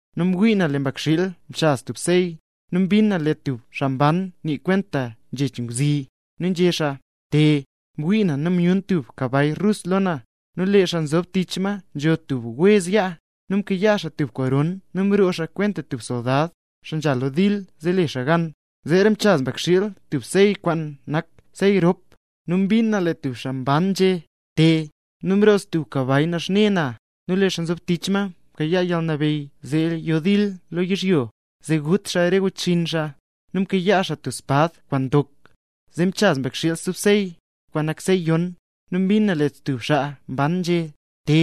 Nu mwii na lee Mbakxiil mchaz tub sey. Nu mbin na lee tub xaa mban nii kwenta nzhech ngwzi, nu nzhé xaa: —¡Te! Mwii na nu myun tub kabay rus lo na; nu lee xaa nzob tich ma nzho tub wez yaa. Nu mkayaa xaa tub koron nu mroo xaa kwenta tub soldad, xaa nzha lo dil zee le xaa gan. Zeera mchaz Mbakxiil stub sey kwaan nak sey rop, nu mbin na lee stub xaa mban nzhé: —¡Te! Nu mroo stub kabay naxne na, nu lee xaa nzob tich ma mkayaa yalnabeyy zee yo dil lo yizhyo, zee gut re xaa wechxinn xaa; nu mkayaa xaa tub espad kwaan ndok. Zeera mchaz Mbakxiil stub sey, kwaan nak sey yon, nu mbin na lee stub xaa mban nzhé: —¡Te!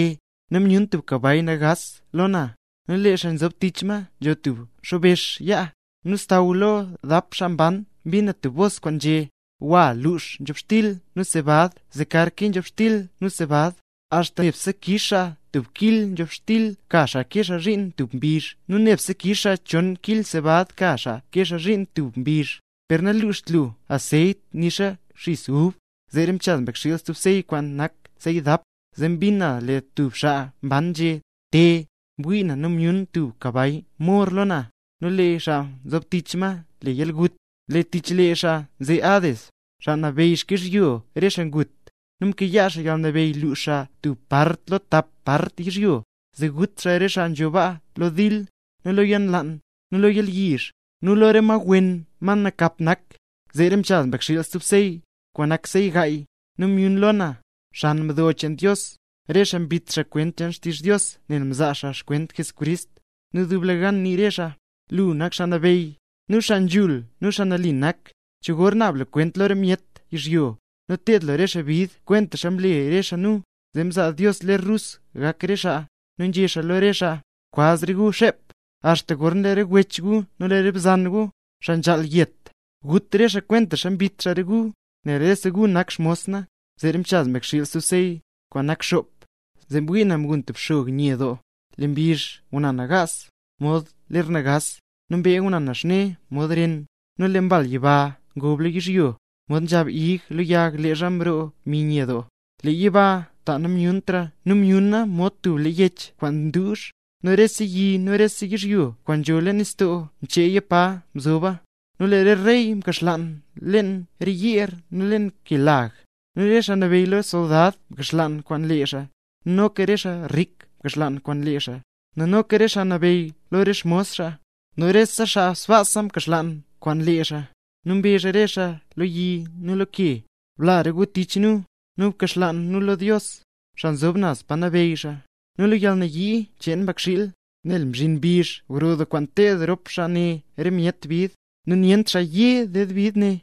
Nu myun tub kabay nagaas lo na, nu lee xaa nzob tich ma nzho tub xobex yaa. Nu xsaww lo dap xaa mban mbin na tub bos kwaan nzhé: —Gwa, lux nzhobxtil nu sebad zee kar nkee nzhobxtil nu sebad, axta nebse kix xaa tub kil nzhobxtil ka xaa kee xaa zhiin tub mbizh nu nebse kix xaa chon kil sebad ka xaa kee xaa zhiin tub mbizh; per naluxt lu anseyt nixa xis ub. Zeera mchaz Mbakxiil stub sey, kwaan nak sey dap, zee mbin na lee stub xaa mban nzhé: —¡Te! Mwii na nu myun stub kabay mor lo na, nu lee xaa nzob tich ma le Yalgut. Nu tich lee xaa nze Hades, xaa nabeyy xkyizhyo re xaa ngut. Nu mkayaa xaa yalnabeyy lux xaa tub part lo tap part yizhyo, zee gut xaa re xaa nzho baa lo dil, nu lo yalnlaan, nu lo yalyizh, nu lo re ma wen ma nakap nak. Zeera mchaz Mbakxiil stub sey, kwaan nak sey gaay. Nu myun lo na, xan mdo cheen Dios, re xaa mbit xaa kwent cheen xtizh Dios nel mzaa xaa xkwent Jesucrist. Nu dublegan nii re xaa: —Lu nak Xaa Nabeyy, nu xaa nzhul nu xaa nali nak. ¿Cho gor naab lu kwent lo re myet yizhyo, nu ted lu re xaa bid kwentaxa mle re xaa nu? Zee mzaa Dios ler rus gak re xaa, nu nzhé xaa lo re xaa: —Kwaz re gu xep, axta gorna lee re wech gu nu re bzan gu, xaa nzhaal yet, gut re xaa, kwentaxa mbit re xaa gu, nel rese gu nak xmos na. Zeera mchaz Mbakxiil stub sey, kwaan nak xop. Zee mwii na mgun tub xog nye doo. Lee mbizh nguna nagaas, mod ler nagaas; lee mbee nguna naxne mod ren, nu lee re mbal yiba ngob lo yizhyo, mod nzhab ig lo yag leezha nroo mbi nye doo. Lee yiba ta namlutra nu myuna mod tub lee yech kwaan nduuzh, nu rese yi nu rese yizhyo kwaan nzho leen nistoo mcheeya pa nzoba. Nu lee re rey mkaxlaan leen re yeer nu leen kelag. Nu re xaa nabeyy lo re soldad mkaxlaan kwaan lee xaa, nu noka re xaa rik mkaxlaan kwaan lee xaa, nu noka re xaa nabeyy nu re xmos xaa, nu re xaa sbaasa mkaxlaan kwaan lee xaa. Nu mbezh re xaa lo re yi nu lo re ke: —¡Bla re gu tich re nu, nu bkaxlaan nu lo Dios, xaa nzob naz pa nabeyy xaa, nu lo yalnayii cheen Mbakxiil! Nel mzhinla mbizh gro doo kwaan ted rop xaa ne re myet bid, ¡nu nyent xaa ye ded bid ne!